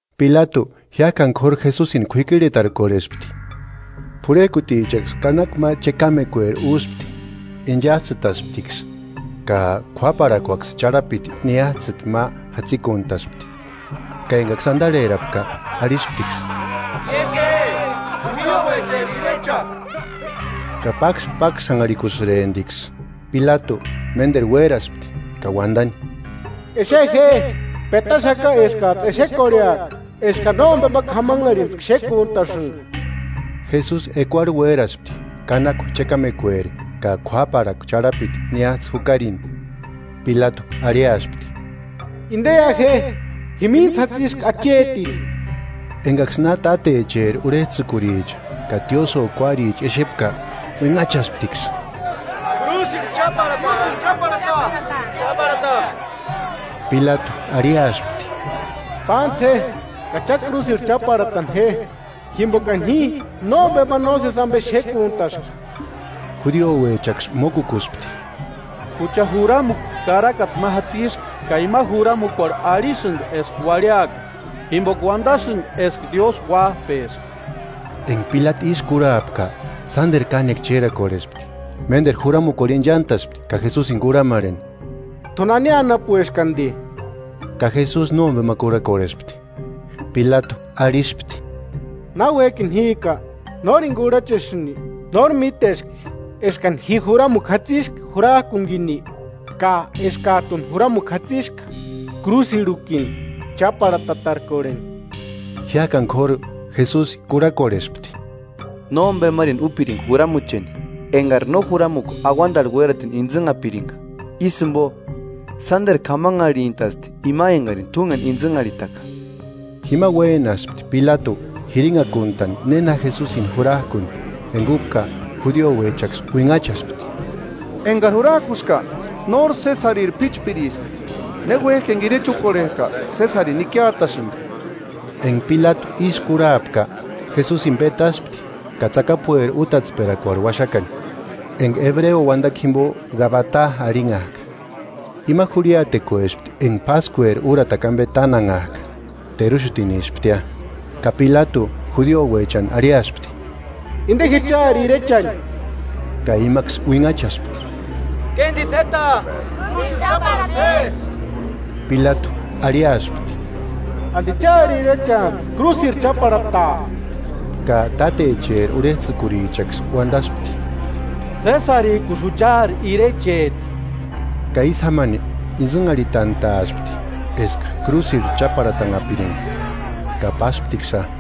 Pilatu jiákani k'óru Jesusini k'uikirhetarkorhespti. P'urhejkutichaksï kanakua ma chekamekueri úspti, inchajtsïtasptiksï ka k'uáparhakuaksï charhapiti niájtsïti ma jatsikuntaspti, ka engaksï andarherapka, arhisptiksï: –¡Ie je, judiouecheri irecha! Ka pákspaksanharhikusïremptiksï. Pilatu ménderu uéraspti ka uandani: –Exe je, petaxaka eskajtsï exekorheaka eskani nómbema k'amanharhitskua xékuntasïnga. Jesusi ekuarhu uéraspti kanakua chekamekueri ka k'uáparhakua charhapiti niájtsï jukarini. Pilatu arhiaspti: –¡Indeia je, jimintsï jatsiska achetini! Engaksï na tátecheri urhejtsïkuricha ka tiosïo kuáricha exepka, uinhachasptiksï: –¡Krúsirhu cháparhata, krúsirhu cháparhata! Pilatu arhiaspti: –Pántsï je ka cha krúsirhu cháparhatani je, jimbokani ji nómbema nósesi ambe xékuntaska. Judiouechaksï mókukuspti: –Jucha juramukua karakata ma jatsiska ka imani juramukuarhu arhisïndi eska uarhiaka, jimboka uandasïnga eska Diósï uájpeska. Enga Pilatu ísï kurhapka, sánderu kánekua chérakorhespti. Ménderu juramukuarhu inchantaspti ka Jesusini kurhamarheni: –¿T'u nani anapueski andi? Ka Jesusi nómbema kurhakorhespti. Pilatu arhispti: –¿Náuejkini jíka, nórini kurhachesïni? ¿Nóri míteski eskani ji juramukua jatsiska jurajkunikini, ka eskajtuni juramukua jatsiska krúsirhukuni cháparhatatarkorheni? Jiájkani k'óru Jesusi kurhakorhespti: –Nómbemarini úpiringa juramucheni engari no juramukua auandarhu uératini intsïnhapiringa; ísï jimbo sánderu k'amanharhintasti ima engarini t'úngeni intsïnharhitaka. Jima uénaspti Pilatu jirinhakuntani néna Jesusini jurajkuni. Enga úpka judiouechaksï uinhachaspti: –¡Engari jurajkuska, nóri Sesariri p'íchpiriska! Ne uéjki enga irecha úkorhejka Sesarini ikiatasïndi. Enga Pilatu ísï kurhapka, Jesusini petaspti ka tsakapueri útatsperakuarhu uaxakani, enga ebreo uandakua jimbo Gabatá arhinhajka. Ima jurhiatekuespti enga páskueri úratakua ambe tánanhajka, teruxutinisptia. Ka Pilatu judiouechani arhiaspti: –¡Inde je chári irechani! Ka imaksï uinhachaspti: –¡Kéndita jéta! ¡Krúsirhu cháparhata je! Pilatu arhiaspti: ¿Andi chári irechantsï krúsirhu cháparhataa? Ka tátecheri urhejtsïkurichaksï uandaspti: Sésarijkusï juchaari irecheti. Ka ísï jámani intsïnharhitantaaspti eska krúsirhu cháparhatanhapiringa. Ka pásptiksïa.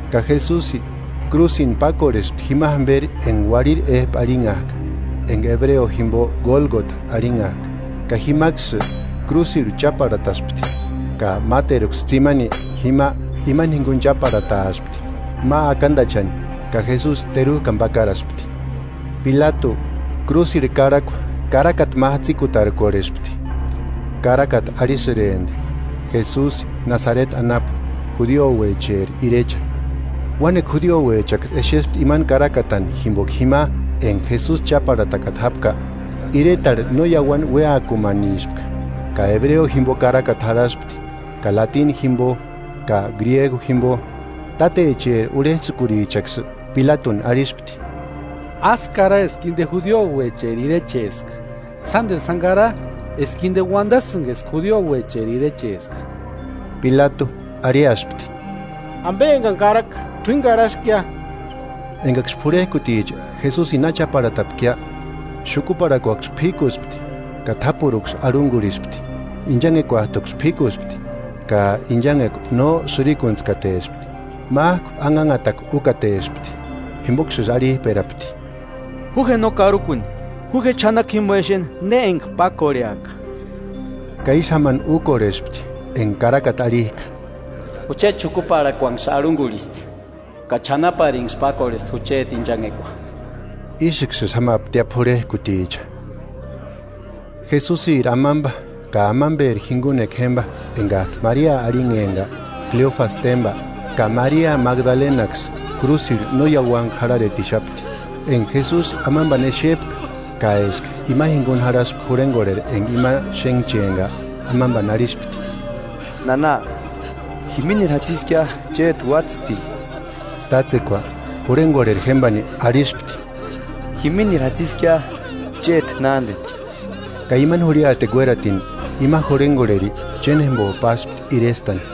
Ka Jesusi krúsini pákorhespti jima jamberi enga Uarhiri Éjpu arhinhajka, enga ebreo jimbo Gólgota arhinhajka ka jimaksï krúsirhu cháparhataspti ka máteruksï tsimani, jima imani jinguni cháparhataaspti ma akandachani ka Jesusi terujkani pakaraspti. Pilatu krúsirhu karhakua karakata ma jatsikutarkorhespti. Karakata arhisïrempti: “Jesusi Nasareti anapu, judiouecheri irecha” Uánekua judiouechaksï exespti imani karakatani jimboka jima enga Jesusi cháparhatakata jápka, iretarhu no iauani ueákumanispka; ka ebreo jimbo karakata jarhaspti, ka latini jimbo ka griegu jimbo. Tátecheri urhejtsïkurichaksï Pilatuni arhispti: –Ásï kara eska inde judiouecheri irecheska, sánderu sáni kara eska inde uandasïnga eska judiouecheri irecheska. Pilatu arhiaspti: Ambe engani karaka, t'uíni karaskia. Engaksï p'urhejkuticha Jesusini na cháparhatapkia, xukuparhakuaksï p'ikuspti, ka t'ápuruksï arhungurhispti. Inchanhekuajtuksï p'íkuspti ka inchanhekua no sïrikuntskatespti, májku anhanhatakua úkatespti. Jimboksïsï arhijperapti: –Ju je no karukuni, ju je ch'anakua jimbo exeni ne enga pákorheaka. Ka ísï jámani úkorhespti enga Karakata arhijka “Jucheti xukuparhakuaksï arhungurhisti ka ch'anaparinksï pákorhesti jucheti inchanhekua.” Ísïksïsï jámaptia p'urhejkuticha. Jesusiri amamba ka amamberi jingunekua jémba engajtu Maria arhinhempka, Cleofasï témba, ka Maria Magdalenaksï krúsirhu no iáuantku jarharetixapti. Enga Jesusi amambani exepka ka eska ima jinguni jarhaspka jurhengorheri enga ima xénhchempka, amambani arhispti: –Nana, jiminiri jatsiskia chéti uatsïtini. Tátsekua jurhengorheri jémbani arhispti: –Jiminiri jatsikia chéti nándeni. Ka imani jurhiatekua uératini ima jurhengorheri chénjembo páspti irestani.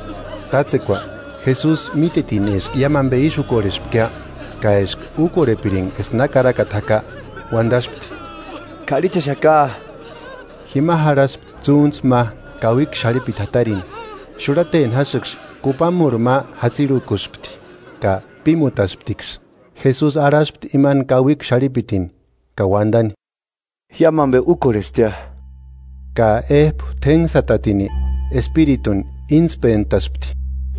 Tátsekua Jesusi mítetini eska iámu ambe ísï úkorhespkia, ka eska úkorhepiringa eska na karakata jaka, uandaspti: –K'arhichaxaka. Jima jarhaspti tsúntsu ma kauikua xarhipiti jatarini. Xurhateni jásïksï kupamurhu ma jatsirhukuspti ka pímutasptiksï. Jesusi arhaspti imani kauikua xarhipitini ka uandani: –Iámu ambe úkorhestia. Ka éjpu t'énhsatatini espirituni íntspentaspti.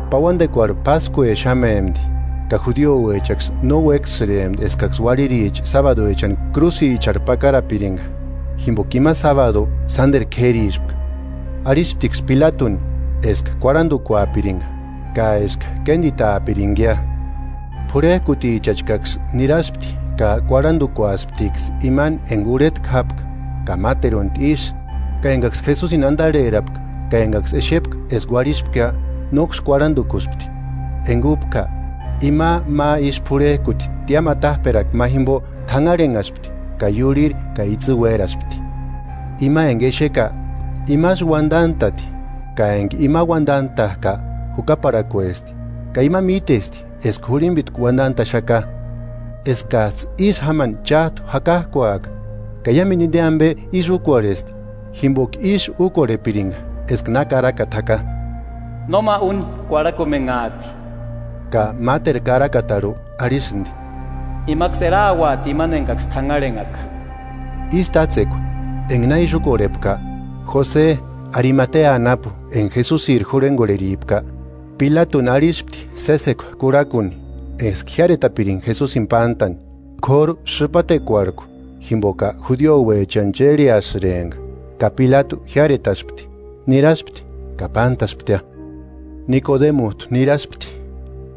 Pauandekuarhu páskuexamempti, ka judiouechaksï no uéksïrempti eskaksï uarhiricha sábaduechani krúsicharhu pakarapiringa, jimboka ima sábadu sánderu k'érispka, arhisptiksï Pilatuni eska kuarhandukuapiringa ka eska kénditaapiringia. P'urhejkutichachkaksï niraspti ka kuarhandukusptiksï imani enga urhetku jápka ka máteruntu isï. Ka engaksï Jesusini andarherapka ka engaksï exepka eska uarhispkia, nóksï kuarhandukuspti. Enga úpka ima ma isï p'urhejkuti tiámu atajperakua ma jimbo t'anharhenhaspti ka iurhiri ka itsï uéraspti. Ima enga exeka, imasï uandantati ka enga ima uandantajka jukaparhakuesti, ka ima mítesti eska jurhimbitku uandantaxaka, eskajtsï ísï jámani chájtu jakajkuaka. Ka iámendu inde ambe ísï úkorhesti, ka eska úkorhepiringa eska na Karakata jaka: “Nóma úni kuarhakumenhaati” Ka máteru Karakatarhu arhisïndi: “Imaksï erauati imani engaksï t'anharhenhaka.” Ísï tátsekua enga na ísï úkorhepka, Jose Arimatea anapu enga Jesusiri jurhengorheripka, Pilatuni arhispti sésekua kurhakuni eska jiáretapiringa Jesusini pántani, k'óru sïpatekuarhku jimboka judiouechani chérheasïrempka. Ka Pilatu jiáretaspti. Niraspti ka pántasptia. Nikodemujtu niraspti,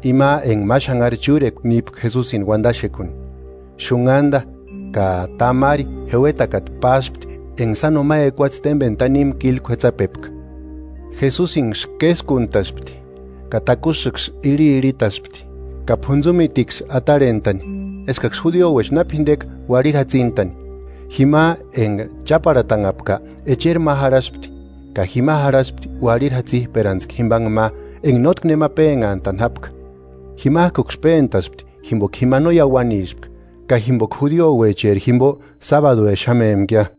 ima enga ma xánhari chúrekua nípka Jesusini uandaxekuni, xunhanda ka tamari jeuetakata páspti enga sáno ma ekuatse témbeni tanimu kílu k'uetsapepka Jesusinksï késkuntaspti ka takusïksï irhiirhitaspti ka p'untsumitiksï atarhentani, eskaksï judiouecha na p'indeka uarhiri jatsintani. Jima enga cháparhatanhapka echeri ma jarhaspti, ka jima jarhaspti uarhiri jatsijperantskua jimbanhe ma enga nótki nema pénhantani jápka. Jimajkuksï péntaspti jimboka jima no iauanispka ka jimboka judiouecheri jimbo sábaduexamempkia.